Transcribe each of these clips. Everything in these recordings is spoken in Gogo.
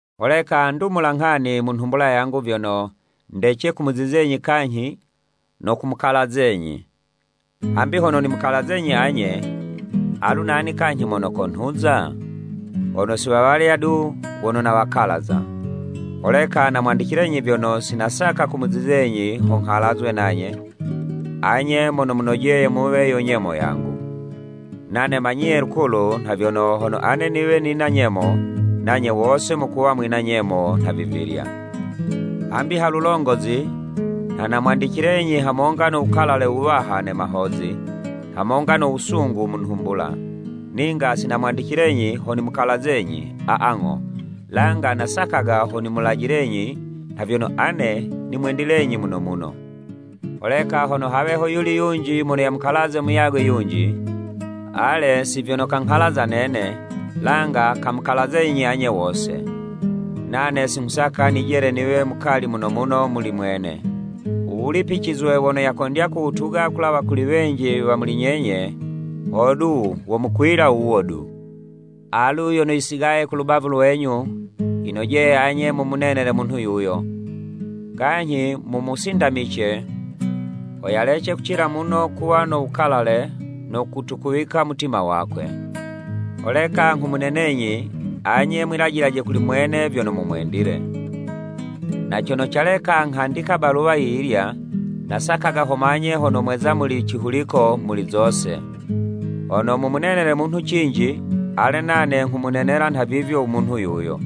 Holeka ndumula nghani mu nhumbula yangu vyono, ndece kumuzizenyi kanyhi no kumukalazenyi. Hambi hono nimukalazenyi anye, alu nani kanyhi mono konhuza? Hono si wawalya du wono nawakalaza! Holeka namwandicilenyi vyono, si nasaka kumuzizenyi ho nghalazwe nanye, anye mono munojeye muwe yo nyemo yangu. Nane manyiye lukulu nha vyono, hono ane niwe nina nyemo, nanye wose mukuwa mwina nyemo nhavivilya. Hambi ha lulongozi, nha namwandicilenyi hamonga no wukalale wuwaha ne mahozi, hamonga no wusungu mu nhumbula, ninga si namwandicilenyi ho nimukalazenyi, aa, ng'o, langa nasakaga ho nimulajilenyi nha vyono ane nimwendilenyi muno muno. Holeka hono hawe hoyuli yunji mono yamukalaze muyagwe yunji, ale, si vyono kanghalaza nene, langa kamukalazenyi anye wose. Nane si nghusaka nijele niwe mukali muno muno muli mwene. U wulipicizwe wono yakondya kuwutuga kulawa kuli wenji wa muli nyenye, hodu womukwila wuwo du. Alu yono yisigaye ku lubavu lwenyu, yinojeye anye mumunenele munhu yuyo, kanyhi mumusindamice, ho yalece kucila muno kuwa no wukalale no kutukuwika mutima wakwe. Holeka nghumunenenyi, anye mwilajilaje kuli mwene vyono mumwendile. Na cono caleka nghandika baluwa yiyilya, nasakaga ho manye hono mweza muli cihuliko muli zose. Hono mumunenele munhu cinji, ale, nane nghumunenela nhavivyo u munhu yuyo.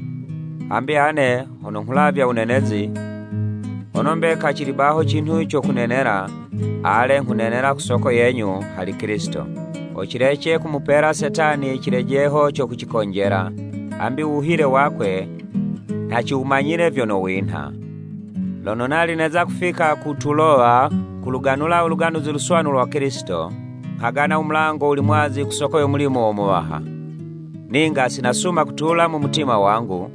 Hambi ane hono nghulavya wunenezi, hono mbeka cili baho cinhu co kunenela, ale, nghunenela ku soko yenyu hali Kilisito, ho cilece kumupela Setani cilejeho co kucikonjela, hambi u wuhile wakwe nha ciwumanyile vyono winha. Lono nali neza kufika ku Tulowa kuluganula u Luganuzi Luswanu lwa Kilisito, nghagana u mulango wuli mwazi ku soko yo mulimo wo Muwaha. Ninga si nasuma kutula mu mutima wangu,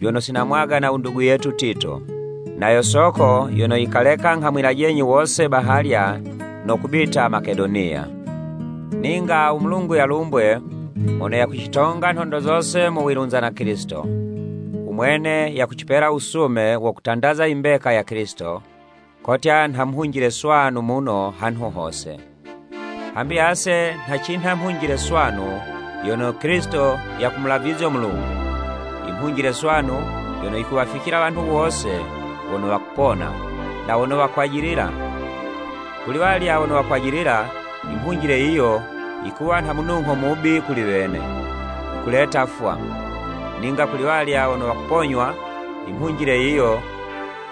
vyono si namwagana u ndugu yetu Tito. Na yo soko yono yikaleka nghamwilajenyi wose bahalya no kubita Makedoniya. Ninga u Mulungu yalumbwe, mono yakucitonga nhondo zose mu wilunza na Kilisito. U mwene yakucipela wusume wo kutandaza i mbeka ya Kilisito, kotya nha mhunjile swanu muno hanhu hose. Hambi ase nha cinha mhunjile swanu yono Kilisito yakumulavizyo Mulungu, i mhunjile swanu yono yikuwaficila wanhu wose wono wakupona, na wono wakwajilila. Kuli'walya wono wakwajilila, i mhunjile yiyo yikuwa nha munungho mubi kuli wene, yikuleta 'fwa, ninga kuli'walya wono wakuponywa, i mhunjile yiyo,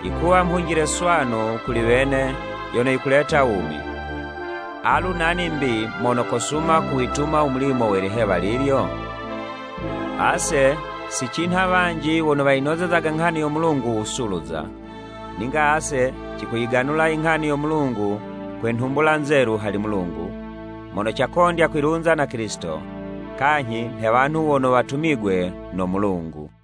yikuwa mhunjile swanu kuli wene yono yikuleta wumi. Alu nani 'mbi mono kosuma kuwituma u mulimo we liwala lilyo? Ase si cinha wanji wono wayinozezaga nghani yo Mulungu wusuluza. Ninga ase cikuyiganula inghani yo Mulungu kwe nhumbula nzelu hali Mulungu, mono cakondya kwilunza na Kilisito, kanyhi nhe wanhu wono watumigwe no Mulungu.